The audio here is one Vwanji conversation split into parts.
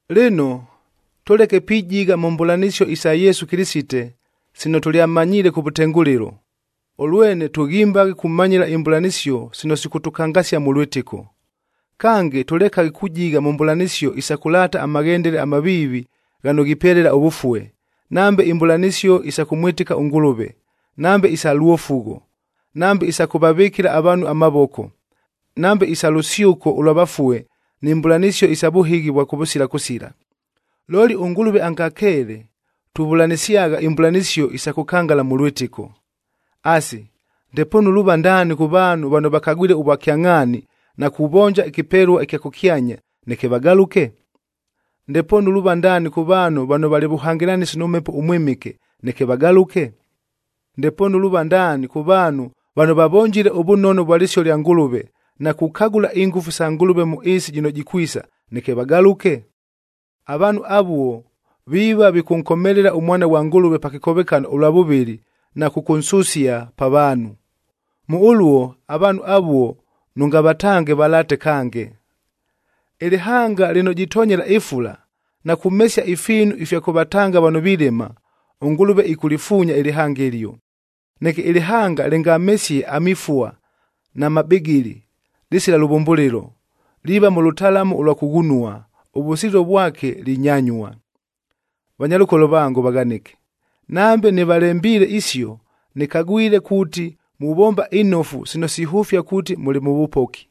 Lɨno, tʉleke pijigha mʉ mbʉlanɨsio isa Yesu Kɨlɨsite, sino tʉlyamanyiile kʉvʉtengʉlɨlo, ʉlwene tʉghimbaghe kumanyɨla imbʉlanɨsio sino sikʉtʉkangasia mʉ lwɨtɨko. Kange, tʉlekaghe kujigha mʉ mbʉlanɨsio isa kʉlaata amaghendele amaviivi ghano ghipelela ʉvʉfue, nambe imbʉlanɨsio isa kʉmwɨtɨka ʉNgʉlʉve, nambe isa lwofugho, nambe isa kʉvavɨkɨla avaanhu amavoko, nambe isa lʉsyʉko ʉlwa vafue ni mbʉlanɨsio isa vʉhɨghi ʉvwa kʉvʉsila kʉsila. Looli ʉNgʉlʉve angakeele, tuvʉlanɨsyagha imbʉlanɨsio isa kʉkangala mʉ lwɨtɨko. Asi, ndepoonu luuva ndaani kʉ vaanhu vano vakagwile ʉvwakyangʼhaani na kuvonja ɨkɨpelua ɨkya kʉkyanya, neke vagalʉke? Ndepoonu luuva ndaani kʉ vaanhu vano valɨ vʉhangɨlanɨsi nʉ Mhepo ʉMwɨmɨke, neke vagalʉke? Ndepoonu luuva ndaani kʉ vaanhu vano vavonjile ʉvʉnono vwa lɨsio lya Ngʉlʉve, na kukagʉla ingʉfu sa Ngʉlʉve mʉ ɨɨsi jɨno jikwisa, neke vagalʉke? Avaanhu avuo viiva vikʉnkomelela ʉMwana ghwa Ngʉlʉve pa kɨkovekano ʉlwa vʉvɨlɨ na kʉkʉnsʉsia pa vaanhu. Mʉ ʉluo avaanhu avuo nʉngavatange valaate kange. Ɨlɨhanga lɨno jitonyela ɨfula, na kumesia ifiinu ifya kʉvatanga vano vilɨma, ʉNgʉlʉve ɨkʉlɨfuunya ɨlɨhanga ɨlio. Neke ɨlɨhanga lɨngamesie amifua na mabɨgɨlɨ, lɨsila lʉvʉmbʉlɨlo, liiva mʉ lʉtalamu ʉlwa kʉghunua. Ʉvʉsililo vwake, linyanyua. Vanyalʉkolo vango vaghanɨke, nambe nɨvalembiile isio, nɨkagwile kuuti muvomba inofu sino sihʉfia kuuti mʉlɨ mʉ vʉpoki.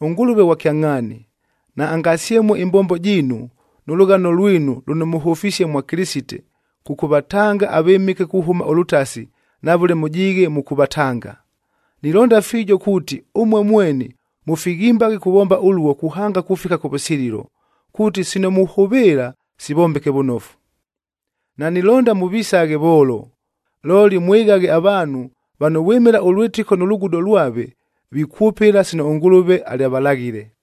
ɄNgʉlʉve ghwa kyangʼhaani, naangasyemue ɨmbombo jiinu, nʉ lʉghano lwinu lʉno mʉhʉfisie mwa Kɨlɨsite kʉkʉvatanga avɨmɨke kuhʉma ʉlʉtasi na vʉle mʉjiighe mʉkʉvatanga. Nilonda fiijo kuuti ʉmue mweni mʉfighimbaghe kuvomba ʉluo kuhanga kufika kʉvʉsililo, kuuti sino muhʉvɨɨla, sivombeke vʉnofu. Nanilonda mʉvisaghe voolo, looli mwɨghaghe avaanhu vano vwɨmɨla ʉlwɨtɨko nʉ lugudo lwave, vikwʉpɨla sino ʉNgʉlʉve alyavalaghile.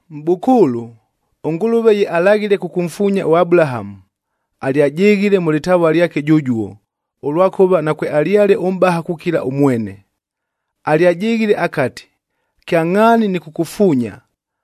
Mʼbʉkʉʉlʉ, ʉNgʉlʉve ye alaghile kʉkʉmfuunya ʉAbulahamu, alyajɨghile mʉ lɨtavua lyake jʉjuo, ʉlwakʉva nakwealyale ʉmʼbaha kukila ʉmwene. Alyajɨghile akati, “Kyangʼhaani nɨkʉkʉfuunya,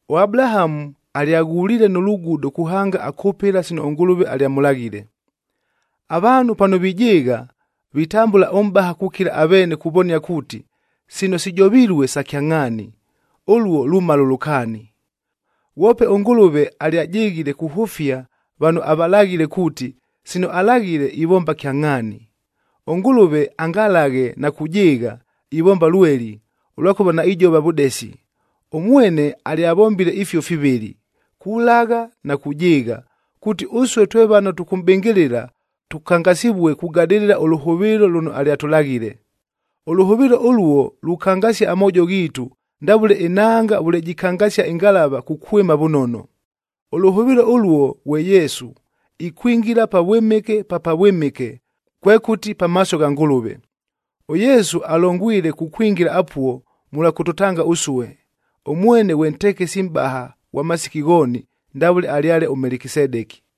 ɄAbulahamu alyaghuliile nʉ lugudo kuhanga akʉpɨla sino ʉNgʉlʉve alyamʉlaghile. Avaanhu pano vijɨɨgha, vitambʉla ʉmʼbaha kukila aveene kuvonia kuuti, sino sijovilue sa kyangʼhaani, ʉluo lumala ʉlʉkaani. Ghwope ʉNgʉlʉve alyajɨghile kuhʉfia vano avalaghile kuuti, sino alaghile, ivomba kyangʼhaani. ɄNgʉlʉve angalaghe na kujɨɨgha, ivomba lweli, ʉlwakʉva naijova vʉdesi. Ʉmwene alyavombile ifio fivɨlɨ, kulagha na kujɨɨgha, kuuti ʉsue twe vano tʉkʉmʼbɨngɨlɨla, tʉkangasɨvue kugadɨlɨla ʉlʉhʉvɨɨlo lʉno alyatʉlaghile. Ʉlʉhʉvɨɨlo ʉluo lukangasia amoojo ghiitu ndavʉle ɨnanga vʉle jɨkangasia ɨngalavab kukwɨma vʉnono. Ʉlʉhʉvɨɨlo ʉluo ghwe Yesu, ikwingila Pavwɨmɨke pa Pavwɨmɨke, kwekʉti pamaaso gha Ngʉlʉve. ɄYesu alongwile kukwingila apuo mʉlwa kʉtʉtanga ʉsue. Ʉmwene ghwe ntekesi mʼbaha ghwa masiki ghooni ndavʉle alyale ʉMelekisedeki.